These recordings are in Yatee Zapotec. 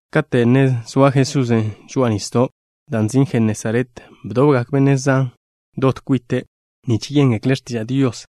Kate' ne zoa Jesusen' žoa'a nisdo', dan' nzin' Jenesaret, bdobgak benne' zan dot kwite', nich yéngekle' x̱tiža' Dios.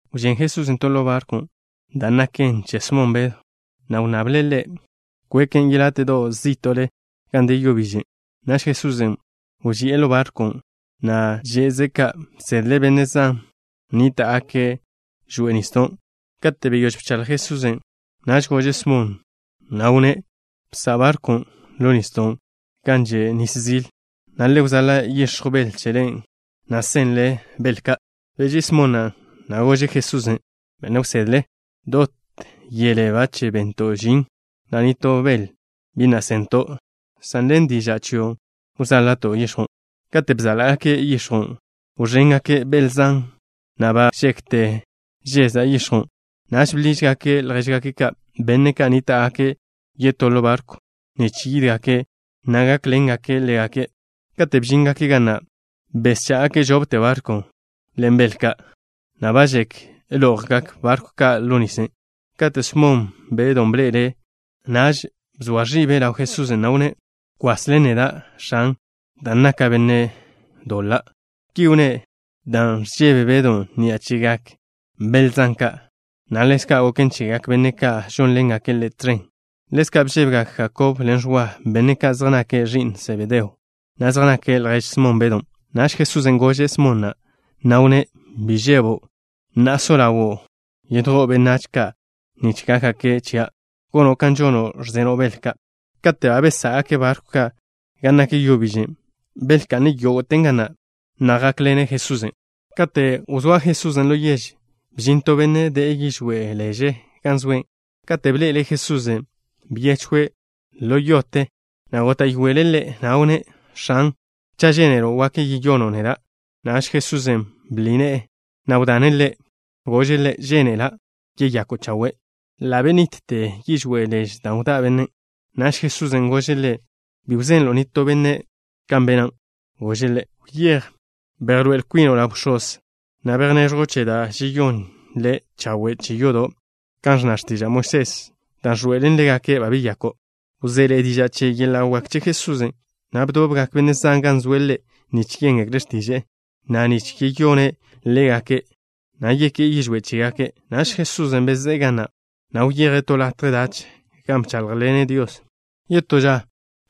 Wžén Jesusen' to ḻo barkwn', dan' naken che Smon Bedw, na' wnnable' ḻe' kweken' yeláte'do' zí'to'le gan de yo bižen'. Naž Jesusen' wži'e ḻo barkwn', na' že'ze' ka', bsedle' benne' zan ka' nníta'gake' ḻo yo bižen'. Kate' beyóž bchaḻj Jesusen', naž gože' Smon, na' wnné': —Bsa' barkw ni ḻo nisdo' gan že' zilen, na' le wzala' yix̱jw bel chele, na' senle bel ka'. Beží'i Smon na', na' gože' Jesusen': —Benne' wsedle, dot yele ba bento' žin, na' nitó bel bi na' sento', san ḻen diža' chio' wzála'to' yix̱jwn'. Kate' bzála'gake' yix̱jwn', wẕéngake' bel zan, na' ba žekte žeza' yix̱jwn'. Naž bḻížgake' ljéžgake' ka', benne' ka' nníta'gake' yetó ḻo barkwn' nich yídgake', na' gákḻengake' ḻégake'. Katen' bžíngake' ga na', beschá'gake' žopte barkw ka' ḻen bel ka', na' ba žek lo'jgak barkw ka' ḻo nisle. Kate' Smon Bedw bḻe'elen', naž bzoa ẕibe' ḻaw Jesusen', na' wnné': —Kwas ḻen neda', X̱an, dan' naka' benne' doḻa'. Ki wnné' dan' ẕžebe Bedon' ni'a chegak bel zan ka', na' ḻezka' goken chegak benne' ka' žónḻengake' ḻe' tẕen. Ḻezka' bžébegak Jakob ḻen Ẕwa, benne' ka' zej nake' ẕi'n Sebedeo, na' zej nake' ljež Smon Bedon'. Naž Jesusen' gože' Smon na', na' wnné': —Bi žebo'. Na'a so ḻawo' yedjó'o benách ka' nich gákgake' chia', gono' kan žono' ẕzeno' bel ka'. Kate' ba besá'gake' barkw ka' gan nak yo bižen', belka'ne' yógo'ten ga na', na' jákḻengake' Jesusen'. Kate' wzóa Jesusen' to yež, bžin to benne' de'e yižwé' leže gan zoe'. Katen' bḻe'ele' Jesusen', byechwe' ḻo yote, na' góta'yoele' Ḻe', na' wnné': —X̱an, cha' žénelo', wak yeyono' neda'. Naž Jesusen' bḻi ne'e, na' wdane' ḻe'. Gože' ḻe': —Žénela'. Yeyako' chawe'. Ḻa' bebižte yižwé' leže da' wdá' bennen'. Naž Jesusen' gože' ḻe' bi wzenle' nitó benne' kan bene'. Gože' ḻe': —Wyéj, bejḻoé'el kwino' ḻaw bx̱oz, na' bejneẕjw che da' žeyón le' chawe' che yodo' kan ẕnna x̱tiža' Moisés, dan' wḻoe'elen ḻégake' ba beyako'. Wzéḻe'e diža' che yeḻa' wak che Jesusen', na' bdobgak benne' zan gan zoe' Ḻe' nich yéngekle' x̱tiže'e, na' nich yeyone' ḻégake', na' yeké'e yižwé' chégake'. Naž Jesusen' bezé'e ga na', na' wyeje' to latje dach, gan bcháḻjḻene' Dios. Yetó ža,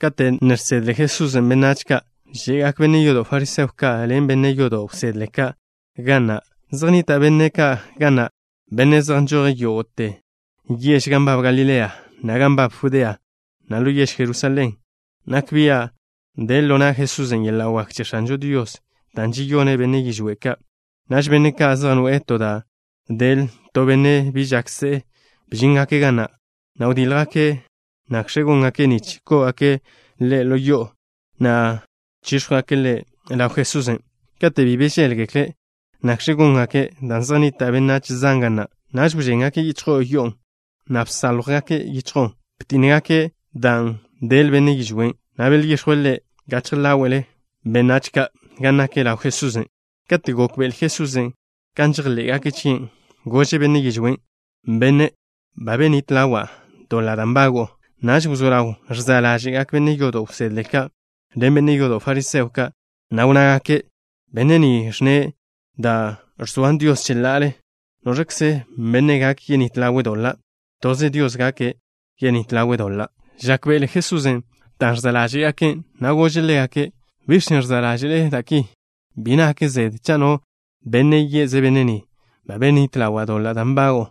kate' ne žsedle Jesusen' benách ka', že'gak benne' yodo' fariseo ka' ḻen benne' yodo' wsedle ka', ga na'. Zej nnita' benne' ka' ga na', benne' zej nžoje' yógo'te yež gan nbab Galilea, na' gan nbab Judea, na' ḻo yež Jerusalén. Nak bia' de ḻo na' Jesusen' yeḻa' wak che X̱anžo Dios dan' žeyone' benne' yižwé' ka'. Naž benne' ka' zej noe'e to da' del to benne' bi žak se'e bžíngake' ga na', na' wdíljgake' nakẕe góngake' nich kó'ogake' ḻe' ḻo yo'o, na' chíx̱jwgake' ḻe' ḻaw Jesusen'. Kate' bi bžéḻgekle' nakẕe góngaken' dan' zej nnita' benách zan ga na', naž wžéngake' yichjo'o yo'on', na' bsáljwgake' yichjo'on'. Btínnegake' dan' del benne' yižwén', na' belyíxjwe' ḻe' gachje ḻáwe'lgak benách ka', gan nak ḻaw Jesusen'. Kate' gókbe'ele Jesusen' kan žejḻé'gake' chie', gože' benne' yižwén': —Benne', ba benít ḻawa' doḻa' da' nbago'o. Naž wzó ḻaw ẕza' ḻáže'gak benne' yodo' wsedle ka' ḻen benne' yodo' fariseo ka', na' wnnágake': —Benne' ni ẕnne' da' ẕzoan Dios cheḻa'ale. ¿Noẕkze benne' gak yenít ḻawe' doḻa'? Toze Dios gak yenít ḻawe' doḻa'. Žákbe'ele Jesusen' dan' ẕza' ḻáže'gake', na' gože' ḻégake': —¿Biẕ chen' ẕza' ḻáže'le da' ki? Bi nak zede cha' no benne' ye'ze' benne' ni: “Ba benít ḻawa' doḻa' da' nbago'o”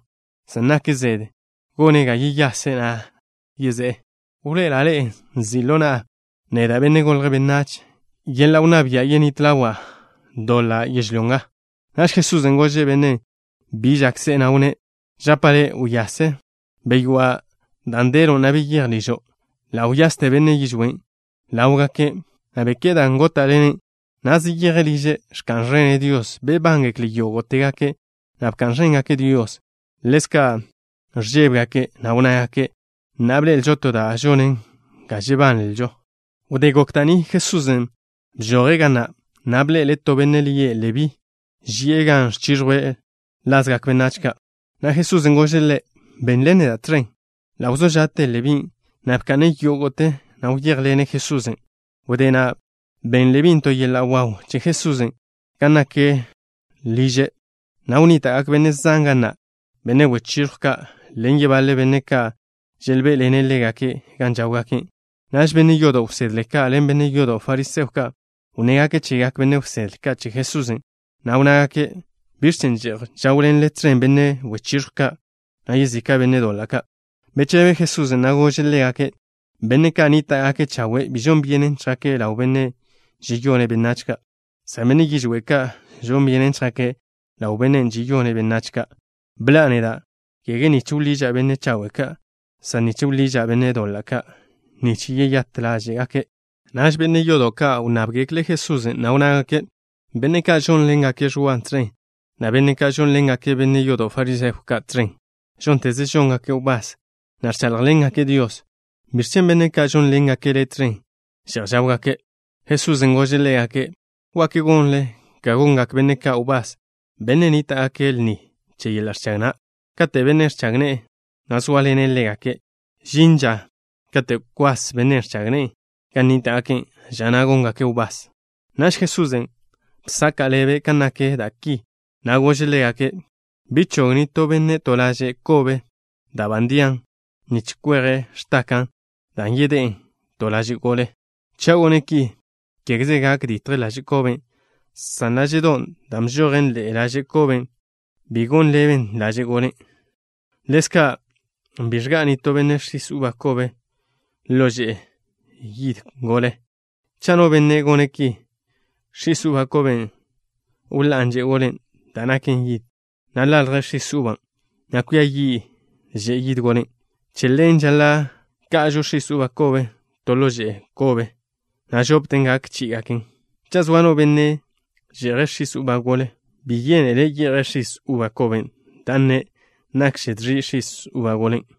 san nak zede gone' ga yeyase', na' se'e. Wḻoe'ela' ḻe'e nzi' ḻo na'a neda', Benne' Golje' Benách, yeḻa' wnná bia' yenít ḻawa' doḻa' yežlyó nga. Naž Jesusen' gože' bennen' bi žak se'e, na' wnné': —Žapa' le', wyase. Beywá' dan' delon', na' beyéj ližo'. Ḻa' wyaste benne' yižwén' ḻáwgake', na' beké'e dan' góta'len', na' zeyeje' liže', ẕka'n ẕene' Dios. Bebángekle' yógo'tegake', na' bka'n ẕéngake' Dios. Ḻezka' ẕžébegake', na' wnnágake': —Na'a bḻe'elžo to da' žonen ga žebanlžo. Wdé gok da' ni, Jesusen' bžoje' ga na', na' bḻe'ele' to benne' lie' Lebí, ži'e gan ẕchiẕjwe' lazgak benách, na' Jesusen' gože' ḻe': —Benḻen neda' tẕen. Ḻa' wzó ža'te Lebín', na' bka'ne' yógo'te, na' wyéjḻene' Jesusen'. Wdé na', ben Lebín' to yeḻa' waw che Jesusen' gan nak ḻo liže', na' wnníta'gak benne' zan ga na', benne' wechiẕjw ka' ḻen yebaḻe benne' ka' želbé'ḻene' ḻégake' gan žáwgake'. Naž benne' yodo' wsedle ka' ḻen benne' yodo' fariseo ka' wnnégake' chegak benne' wsedle ka' che Jesusen', na' wnnágake': —¿Biẕ chen' že'j žáwḻenle tẕen benne' wechiẕjw ka', na' yezika' benne' doḻa' ka'? Bechebe Jesusen', na' gože' ḻégake': —Benne' ka' nníta'gake' chawe' bi žon byenen chjake' ḻaw benne' žeyone' benách ka', san benne' yižwé' ka' žon byenen chjake' ḻaw bennen' žeyone' benách ka'. Bḻa'a neda', kege nich wḻiža' benne' chawe' ka', san nich wḻiža' benne' doḻa' ka' nich yeyát ḻáže'gake'. Naž benne' yodo' ka' wnnábgekle' Jesusen', na' wnnágake': —Benne' ka' žónḻengake' Ẕwa tẕen, na' benne' ka' žónḻengake' benne' yodo' fariseo ka' tẕen, žónteze žóngake' wbás, na' ẕcháḻjḻengake' Dios. ¿Biẕ chen' benne' ka' žónḻengake' Le' tẕen že'j žáwgake'? Jesusen' gože' ḻégake': —¿Wak gonle ga gongak benne' ka' wbás, benne' nníta'gake' lni che yeḻa' ẕchag na', kate' benne' ẕchag ne'e ne zóaḻene' ḻégake'? Žin ža kate' kwas benne' ẕchag ne'e gan nníta'gake'. Ža na' góngake' wbás. Naž Jesusen' bsaka' ḻebe' kan nak da' ki, na' gože' ḻégake': —Bi chog nitó benne' to laže' kobe dan' ba ndian, nich kweje' x̱taka' dan' yedé'e ḻe'e to laže' gole. Cha' gone' ki, kégeze gak ditj laže' koben', san láže'don' dan' bžojen ḻe'e laže' koben' bi gon ḻeben laže' golen'. Ḻezka', bi ẕga'a nitó benne' x̱is uba kobe ḻo že'e yid gole. Cha' no benne' gone' ki, x̱is uba koben' wḻá'an že'e golen' da' naken yid, na' ḻalj x̱is uban', na' cwia yi' že'e yid golen'. Che ḻen žaḻa' ka'ažo x̱is uba kobe to ḻo že'e yid kobe, na' žopten gak chí'igaken. Cha' zoa no benne' že'je' x̱is uba gole, bi yénetele' ye'je' x̱is uba kobe, dan' nne': “Nakže dẕi' x̱is uba golen'.”